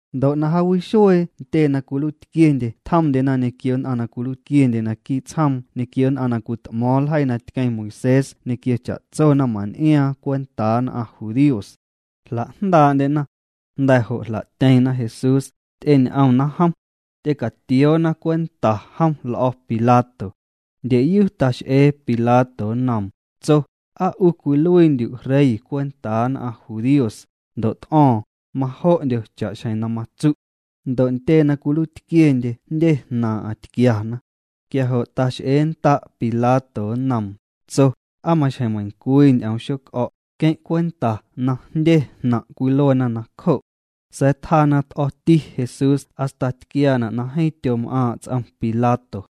Ndo' na jaawixuee ntyee na cwiluiitquiendye tjomndyena ñequio nn'aⁿ na cwiluiitquiendye naquii' tsjoom ñequio nn'aⁿ na cwit'mo̱o̱ⁿ ljeii na tqueⁿ Moisés ñequio cha'tso naⁿman'iaaⁿ cwentaa nn'aⁿ judíos. Jla'jndaa'ndyena. Jnda̱ jo' jla'tyeⁿna Jesús, ty'eñ'omna jom. Ty'ecatioona cwenta jom l'o̱ Pilato. Ndyeyu tax'ee Pilato nnoom, tso: —¿Aa 'u cwiluiindyu' rey cwentaa nn'aⁿ judíos? Ndo' t'o̱o̱ⁿ: —Majo'ndyo cha'xjeⁿ na matsu'. Ndo' ntyee na cwiluiitquiendye jndye jnaaⁿ'aⁿ tquiana. Quia jo' tax'eennda' Pilato nnoom, tso: —¿Aa maxjeⁿ meiⁿcwii ñ'oom xoc'o̱'? Queⁿ' cwenta na jndye jnaⁿ' cwiluena nacjo'. Sa̱a̱ tjaa na t'o̱ti Jesús hasta tquiaana' na jeeⁿ tyom'aaⁿ' ts'om Pilato.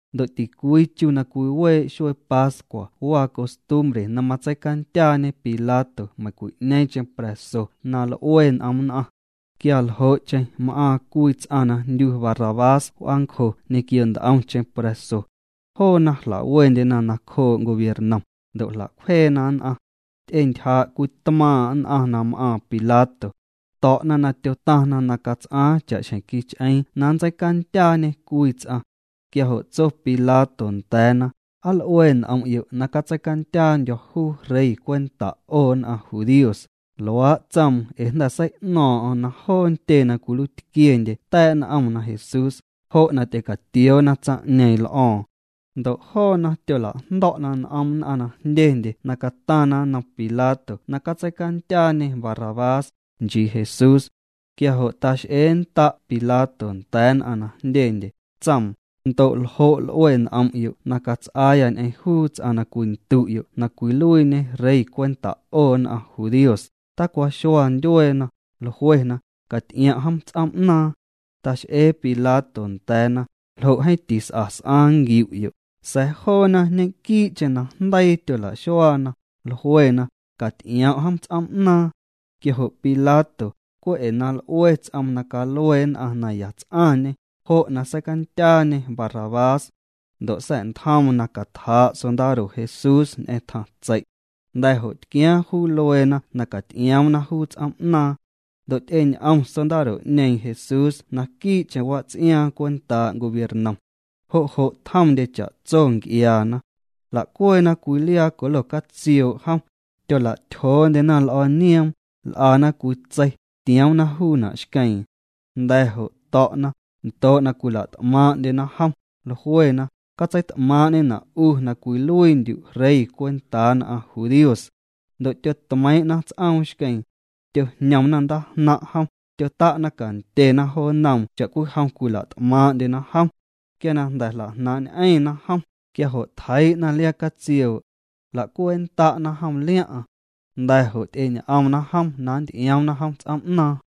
Ndo' ticwii chu na cwiwee' xuee pascua waa costumbre na matseicandyaañe Pilato meiⁿcwi'ñeeⁿcheⁿ pra̱so na l'ue n'om nn'aⁿ. Quia ljo'cheⁿ m'aaⁿ cwii ts'aⁿ na jndyu Barrabás w'aancjo ñequio nt'omcheⁿ pra̱so. Joona jla'wendyena nacjoo' gobiernom, ndo' jla'cwjeena nn'aⁿ. Ty'entyjaa' cwii tmaaⁿ' nn'aⁿ na m'aaⁿ Pilato. To̱'na na tyotaⁿna na cats'aaⁿ cha'xjeⁿ quich'eeⁿ na nntseicandyaañê cwii ts'aⁿ. Quia jo' tso Pilato nda̱a̱na: —¿Aa l'ue n'om'yo' na catseicandyaandyo̱ juu rey cwenta 'o nn'aⁿ judíos? Luaa' tsoom ee jnda̱ sei'no̱o̱ⁿ'o̱ⁿ na joo ntyee na cwiluiitquiendye ta̱a̱' n'omna Jesús, jo' na ty'ecatioona tsaⁿ'ñeeⁿ l'o̱o̱ⁿ. Ndo' joona tyola'jndo̱'na n'om nn'aⁿ na jndyendye na cataⁿna nnom Pilato na catseicandyaañê Barrabás, nchii Jesús. Quia jo' tax'eennda' Pilato nda̱a̱ nn'aⁿ na jndyendye, tsoom: —Ndo' ¿ljo' l'ue n'om'yo' na cats'aaya ñ'eⁿ juu ts'aⁿ na cwindu'yo' na cwiluiiñe rey cwenta' 'o nn'aⁿ judíos? Tacwaxua ndyueena, jluena: —Caty'iom' jom ts'oom'naaⁿ. Tax'ee Pilato nda̱a̱na: —¿Ljo' jeeⁿ tis'a s'aaⁿ nquiu'yo'? Sa̱a̱ joona ñe'quii'cheⁿ najndeii tyola'xuaana, jluena: —Caty'iom' jom ts'oom'naaⁿ. Quia jo' Pilato, cwe' ee na l'ue ts'oom na calue nn'aⁿ na ya ts'aⁿñê, jo' na seicandyaañê Barrabás. Ndo' sa̱'ntjoom na catjaa' sondaro Jesús ñ'eⁿ tjaⁿtsei'. Jnda̱ jo' tquiaaⁿ juu lueena na caty'ioomna juu ts'oom'naaⁿ. Ndo' ty'eñ'om sondaro'ñeeⁿ Jesús naquii'cheⁿ wats'iaaⁿ cwentaa' gobiernom. Jo' jo' tjomndye cha'tso nc'iaana. Jla'cweena cwii liaa colo catsioo' jom. Tyola'tyjoondyena l'o̱o̱ nioom, l'ana cwii tsei, tioomna juuna' xqueeⁿ. Jnda̱ jo' to̱'na, ndoo' na cwila't'maaⁿ'ndyena jom, jluena: —Catseit'maaⁿ'ñena' 'u na cwiluiindyu' rey cwentaa nn'aⁿ judíos. Ndo' tyotmeiiⁿ'na ts'oom xqueeⁿ. Tyojñomna ndaajnaⁿ' jom, tyota'na cantyena jo nnoom cha'cwijom cwila't'maaⁿ'ndyena jom. Quia na jnda̱ jla'jnaaⁿ'ñ'eⁿna jom, quia jo' tjeii'na liaa catsioo'. Jla'cweennda'na jom liaⁿ'aⁿ. Jnda̱ jo' ty'eñ'omna jom na nnty'ioomna jom ts'oom'naaⁿ.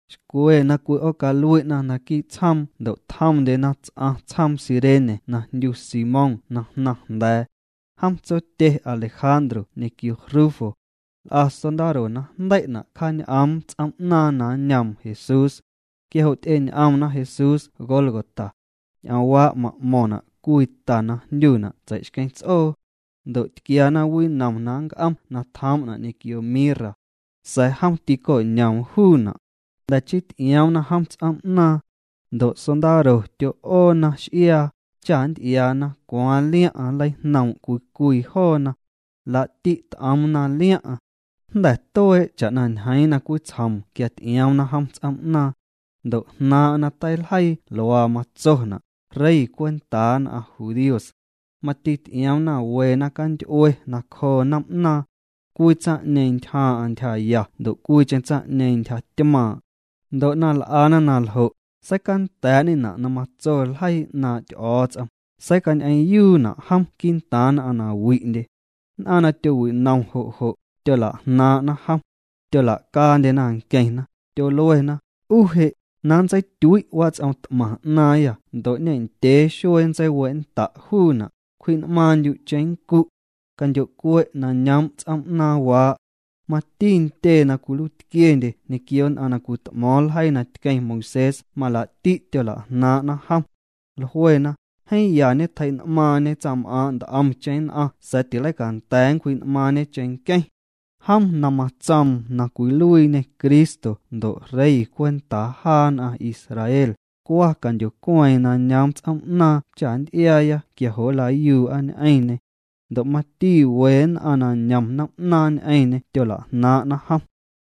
Xcwe na cwi'oocalui'na naquii' tsjoom ndo' tjomndyena ts'aⁿ tsjoom Cirene na jndyu Simón na jnaⁿ jnda̱a̱. Jom tsotye Alejandro ñequio Rufo. L'a sondaro na jndei'na' cjaañ'oom ts'oom na nñoom Jesús. Quia jo' ty'eñ'omna Jesús Gólgota. Ñ'oomwaa' ma'mo̱ⁿna' cwii ta na jndyuna' Tsei'xqueⁿ Ts'oo. Ndo' tquiana winom na nnc'om na tjoom'na' ñequio mirra. Sa̱a̱ jom tîco'ñoom juuna'. Jnda̱ chii ty'ioomna jom ts'oom'naaⁿ. Ndo' sondaro tyo'oona x'iaa, cha nnty'iaana cwaaⁿ liaⁿ'aⁿ nleijnoom' cwii cwii joona. Laa'ti' t'oomna liaⁿ'aⁿ. Jnda̱ tuee' cha'na ñjeeⁿ nacwitsjoom quia ty'ioomna jom ts'oom'naaⁿ. Ndo' jnaaⁿ'aⁿ na teiljeii luaa matsona': “Rey cwenta nn'aⁿ judíos.” Mati ty'ioomna we naⁿcanty'ue nacjoo noom'naaⁿ. Cwii tsaⁿ'ñeeⁿ ntyjaaⁿ'aⁿ ntyjaya ndo' cwiicheⁿ tsaⁿ'ñeeⁿ ntyjatymaaⁿ'. Ndo' na l'ana na ljo', seicanda̱a̱'ñena' na matso ljeii 'naaⁿ' Ty'o̱o̱ts'om: “Seicañ'eⁿyuuna' jom quii'ntaaⁿ nn'aⁿ na wi'ndye.” Nn'aⁿ na tyowinom jo' jo', tyola'jnaaⁿ'na jom. Tyola'caandyena nqueⁿna, tyoluena: —'U je', na nntseityui' wats'om t'maⁿ 'naaⁿyâ ndo' ñendyee xuee nntseiwe'nnda' juuna', cwji'n'maaⁿndyu' cheⁿnncu'. Candyo'cue' na ñoom' ts'oom'naaⁿwaa'. Mati ntyee na cwiluiitquiendye ñequio nn'aⁿ na cwit'mo̱o̱ⁿ ljeii na tqueⁿ Moisés malaa'ti' tyola'jnaaⁿ'na jom. Jluena: —Jeeⁿ ya ñetjei'n'maaⁿñe tsaⁿm'aaⁿ' nt'omcheⁿ nn'aⁿ sa̱a̱ tileicanda̱a̱ nncwji'n'maaⁿñe cheⁿnqueⁿ. Jom na matsoom na cwiluiiñê Cristo ndo' Rey cwentaa jaa nn'aⁿ Israel, cwa candyocueeⁿ na ñoom ts'oom'naaⁿ cha nnty'iaaya quia jo' nlayuu'a ñ'eⁿñê. Ndo' mati we nn'aⁿ na ñom noom'naaⁿ ñ'eⁿñê tyola'jnaaⁿ'na jom.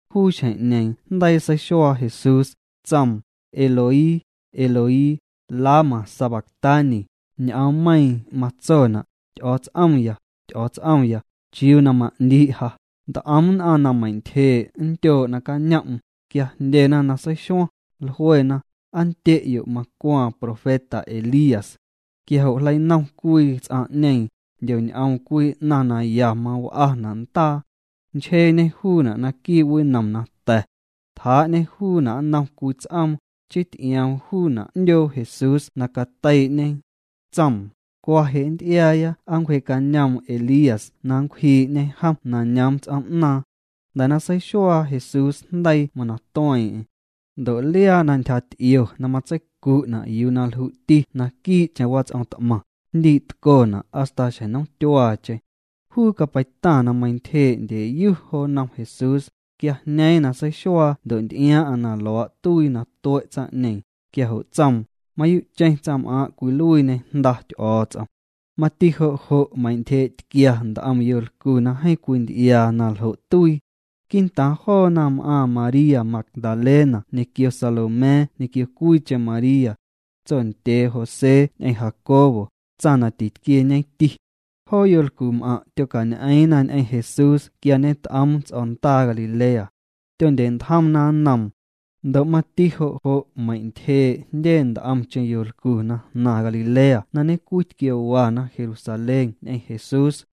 Juu xjeⁿ'ñeeⁿ jndeii seixuaa Jesús, tsoom: —Eloi, Eloi, ¿lama sabactani? (Ñ'oommeiiⁿ matsona': Ty'o̱o̱ts'omya, Ty'o̱o̱ts'omya, ¿chiuu na ma'ndii' ja?) Nt'om nn'aⁿ na meintyjee' nndyoo' nacañom'm, quia jndyena na seixuaⁿ, jluena: —Aa ndye'yo', macwaaⁿ profeta Elías. Quia jo' jleinom cwii ts'aⁿ'ñeeⁿ, jndyoñ'oom cwii 'naⁿ na ya maw'ana' ndaa. Nchjeeñê juuna' naquii' winom na ta̱. Tjaa'ñê juuna' nnom cwii ts'oom, chii ty'ioom juuna' 'ndyoo Jesús na cateii'ñe. Tsoom: —Cwa je' nnty'iaaya aa nncwjee'cañoom Elías na nncwjii'ñe jom na ñoom ts'oom'naaⁿ. Jnda̱ na seixuaa Jesús jndeii mana tueeⁿ'eⁿ. Ndo' liaa na ntyjaty'io na matseicu'na' yuu na lju'ti naquii'cheⁿ wats'om t'maⁿ, jndii'tcona' hasta xjeⁿ nomtyuaacheⁿ. Juu capeitaⁿ na meintyjee' ndyeyu jo nnom Jesús, quia jñeeⁿ na seixuaa ndo' nty'iaaⁿ'aⁿ na luaa' tuii na tue' tsaⁿ'ñeeⁿ, quia jo' tsoom: —Mayuu'cheⁿ tsaⁿm'aaⁿ' cwiluiiñê Jnda Ty'o̱o̱ts'om. Mati jo' jo' meintyjee'tquia nt'om yolcu na jeeⁿ cwinty'iaa na ljo' tuii. Quii'ntaaⁿ joona m'aaⁿ María Magdalena ñequio Salomé ñequio cwiicheⁿ María, tsondyee José ñ'eⁿ Jacobo, tsaⁿ na titquieñeti. Joo yolcum'aⁿ' tyocañ'eeⁿna ñ'eⁿ Jesús quia ñet'oom ts'o̱ndaa Galilea. Tyondye'ntjomna nnoom. Ndo' mati jo' jo' meintyjee' jndye nt'omcheⁿ yolcu na jnaⁿ Galilea na ñencwi tquiowana Jerusalén ñ'eⁿ Jesús.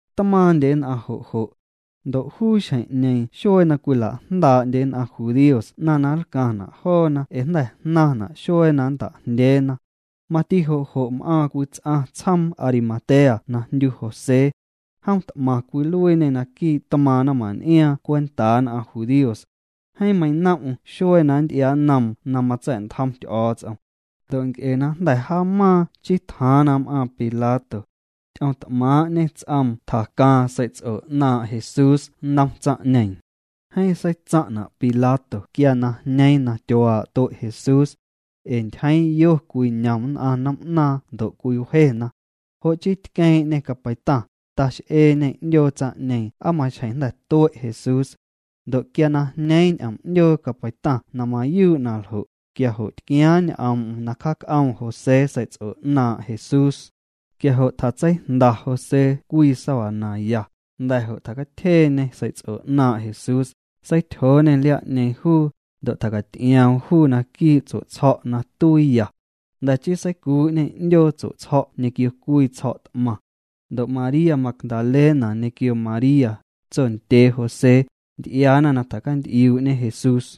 Tmaaⁿndye nn'aⁿ jo' jo'. Ndo' juu xjeⁿ'ñeeⁿ xuee na cwila'jndaa'ndye nn'aⁿ jndíos 'naⁿ na nlcaⁿna' joona ee jnda̱ jnaⁿna' xuee na nnta'jndyeena. Mati jo' jo' m'aaⁿ cwii ts'aⁿ tsjoom Arimatea na jndyu José. Jom t'maⁿ cwiluiiñê naquii' tmaaⁿ' naⁿman'iaaⁿ cwentaa nn'aⁿ judíos. Jeeⁿ meinom'm xuee na nnty'iaa'nnoom na matsa̱'ntjom Ty'o̱o̱ts'om. Ndo' nc'e na jnda̱ jaamaaⁿ chii tjaaⁿ na m'aaⁿ Pilato. Ty'oomt'maaⁿ'ñê ts'oom tjacaaⁿ sei'ts'o 'naaⁿ' Jesús nnom tsaⁿ'ñeeⁿ. Jeeⁿ seitsaⁿ'na' Pilato quia na jñeeⁿ na tyuaa' tue' Jesús. Ee ntyjeeⁿ yo cwiñom nn'aⁿ noom'naaⁿ ndo' cwiwjena. Jo' chii tqueeⁿ'ñê capeitaⁿ, tax'eeñê 'ndyoo tsaⁿ'ñeeⁿ aa maxjeⁿ jnda̱ tue' Jesús. Ndo' quia na jñeeⁿ ñ'oom 'ndyoo capeitaⁿ na mayuu' na ljo', quia jo' tquiaaⁿ ñ'oom'm na cjaañ'oom José sei'ts'o 'naaⁿ' Jesús. Quia jo' tjatseijnda José cwii sábana ya, jnda̱ jo' tjacatyjeeñê sei'ts'o 'naaⁿ' Jesús, seityjooñê liaa'ñeeⁿ juu, ndo' tjacaty'ioom juu naquii' tsue'tsjo̱' na tuiiya. Jnda̱ chii seicuu'ñê 'ndyoo tsue'tsjo̱' ñequio cwii tsjo̱' t'maⁿ. Ndo' María Magdalena ñequio María, tsondyee José, nty'iaana na tjacant'iuu'ñe Jesús.